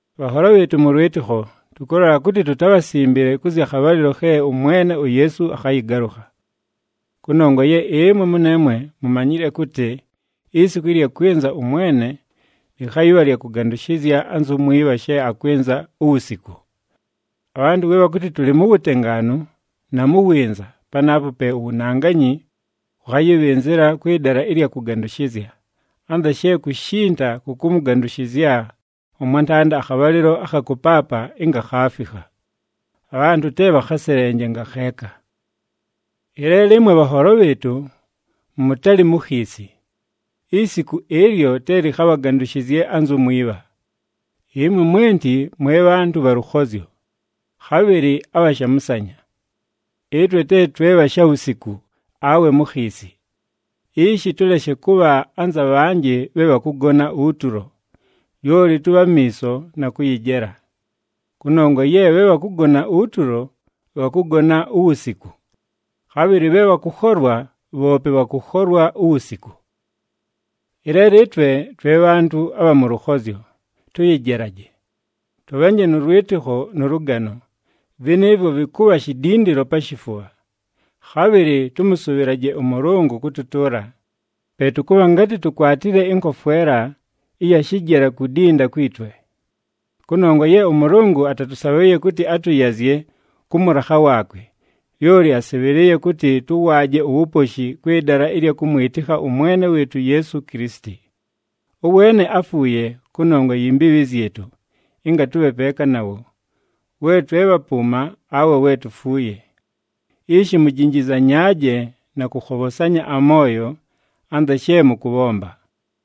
Bhanholo bhɨɨtʉ mʉ lwɨtɨkho, tʉkʉlola kʉtɨ tutabhasimbile kʉ zya khabhalɨlo khe ʉMwene uYeesu akhayɨgalʉkha. Kʉnongwa ye ɨmwe mʉneemwe mumanyile kʉtɨ isiku ɨlya kwɨnza ʉMwene, lɨkhayɨbha lya kʉgandʉshɨzya anzu mwibha she akwɨnza uwusiku. Abhantʉ we bhakʉtɨ tʉlɨ mu wutengaanu na mu winza, panaapo pe uwunanganyi wʉkhayɨbhɨnzɨla kwɨ dala ɨlya kʉgandʉshɨzya, anza she kushinda kʉkʉmʉgandʉshɨzya ʉmwantanda akhabhalɨlo akha kʉpaapa ɨnga khaafikha. Abhantʉ te bhakhaselenje ngakheeka. Ɨleelo ɨmwe bhanholo bhɨɨtʉ mʉtalɨ mu khiisi, isiku ɨlyo te lɨkhabhagandʉshɨzye anzu mwibha. Ɨmwe mwenti mwe bhantʉ bha lʉkhozyo, khabhɨlɨ abha shamʉsanya. Ɨtwe te twe bha shawusiku awe mu khiisi. Ishi tʉleshe kʉbha anza bhanjɨ bhe bhakʉgona utulo, lyoli tʉbhe amiiso na kʉyɨjela. Kʉnongwa ye bhe bhakʉgona utulo, bhakʉgona uwusiku. Khabhɨlɨ bhe bhakʉkholwa bhoope bhakʉkholwa uwusiku. Ɨleelo ɨtwe twe bhantʉ abha mʉ lʉkhozyo, tʉyɨjelaje. Tʉbhanje nʉ lwɨtɨkho nʉ lʉgano, vɨnɨɨvwo vɨkʉbha shidindilo pa shifubha. Khabhɨlɨ tʉmʉsʉbhɨlaje ʉMʉlʉngʉ kʉtʉtʉʉla, pe tʉkʉbha ngatɨ tukwatile ɨnkofwela ɨya shɨjela kudinda kwi twe. Kʉnongwa ye ʉMʉlʉngʉ atatʉsabhʉʉye kʉtɨ atʉyazye kʉ mʉlakha waakwe, lyoli asɨbhɨlɨɨye kʉtɨ tʉwaaje uwuposhi kwɨ dala ɨlya kʉmwɨtɨkha ʉMwene wɨɨtʉ uYeesu Kilisiti. Ʉweene áfuuye kʉnongwa yi mbiibhi zyɨtʉ ɨnga tʉbhe peeka nawo, we twe bhapʉʉma awe we tufuuye. Ishi mujinjizanyaaje na kʉkhobhosanya amooyo anza she mʉkʉbhomba.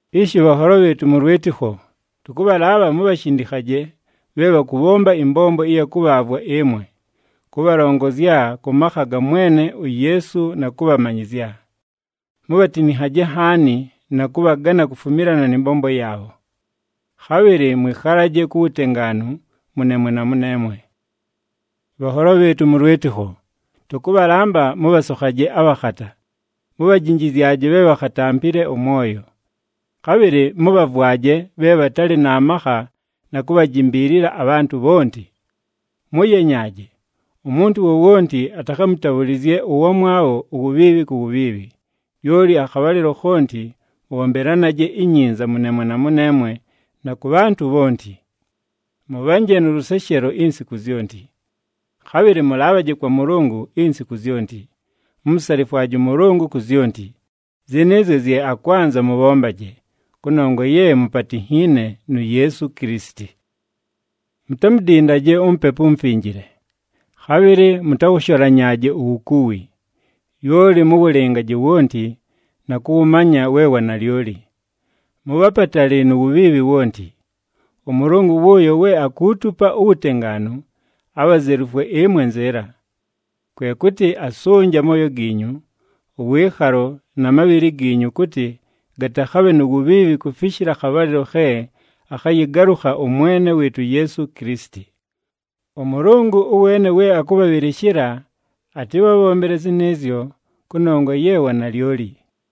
Ishi bhanholo bhɨɨtʉ mʉ lwɨtɨkho, tʉkʉbhalaabha mubhashindikhaje bhe bhakʉbhomba ɨmbombo ɨya kʉbhaavwa ɨmwe, kʉbhalongozya kʉ makha ga Mwene uYeesu na kʉbhamanyɨzya. Mubhatinikhaje nhaani na kʉbhagana kufumilana nɨ mbombo yaabho. Khabhɨlɨ mwɨkhalaje ku wutengaanu mʉneemwe na mʉneemwe. Bhanholo bhɨɨtʉ mʉ lwɨtɨkho, tʉkʉbhalamba mʉbhasokhaje abhakhata, mubhajinjizyaje bhe bhakhatampile ʉmwoyo. Khabhɨlɨ mʉbhavwaje bhe bhatalɨ na makha na kubhajimbiilila abhantʉ bhonti. Mʉyenyaaje, umuntu wowonti atakhamʉtabhʉlɨzye ʉwamwabho uwubhiibhi ku wubhiibhi, lyoli akhabhalɨlo khonti mʉbhombelanaje inyinza mʉneemwe na mʉneemwe na kʉ bhantʉ bhonti. Mʉbhanje nʉ lʉseshelo insiku zyonti. Khabhɨlɨ mʉlaabhaje kwa Mʉlʉngʉ insiku zyonti. Mumusalifwaje ʉMʉlʉngʉ ku zyonti, zɨnɨɨzyo zye akwanza mʉbhombaje, kʉnongwa ye mupatinhiine nu Yeesu Kilisiti. Mutamudindaje uMupepu uMufinjile. Khabhɨlɨ mʉtawʉsholanyaaje uwukuwi, lyoli mʉwʉlɨngaje wonti, na kʉwʉmanya we wanalyoli. Mʉbhe apatali nu wubhiibhi wonti. ɄMʉlʉngʉ wʉʉyo we akuutupa uwutengaanu abhazelufwe ɨmwe nzɨɨla. Kwe kʉtɨ asʉnje amooyo giinyu, ʉwɨɨkhalo na mabhɨlɨ giinyu kʉtɨ gatakhabhe nu wubhiibhi kufishila akhabhalɨlo khe akhayɨgalʉkha ʉMwene wɨɨtʉ uYeesu Kilisiti. ɄMʉlʉngʉ ʉweene we akʉbhabhɨlɨshɨla atɨbhabhombele zɨnɨɨzyo, kʉnongwa ye wa nalyoli.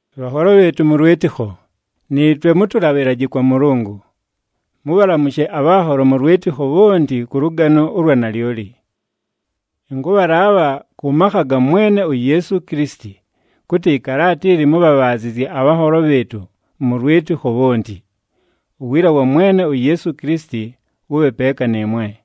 Bhanholo bhɨɨtʉ mʉ lwɨtɨkho, nɨɨtwe mʉtʉlabhɨlaje kwa Mʉlʉngʉ. Mʉbhalamʉshe abhanholo mʉ lwɨtɨkho bhonti kʉ lʉgano ʉlwa nalyoli. Ɨnkʉbhalaabha kʉ makha ga Mwene uYeesu Kilisiti kʉtɨ ɨkalaata ili mʉbhabhaazɨzye abhanholo bhɨɨtʉ mʉ lwɨtɨkho bhonti. Uwiila wa Mwene uYeesu Kilisiti wʉbhe peeka nɨɨmwe.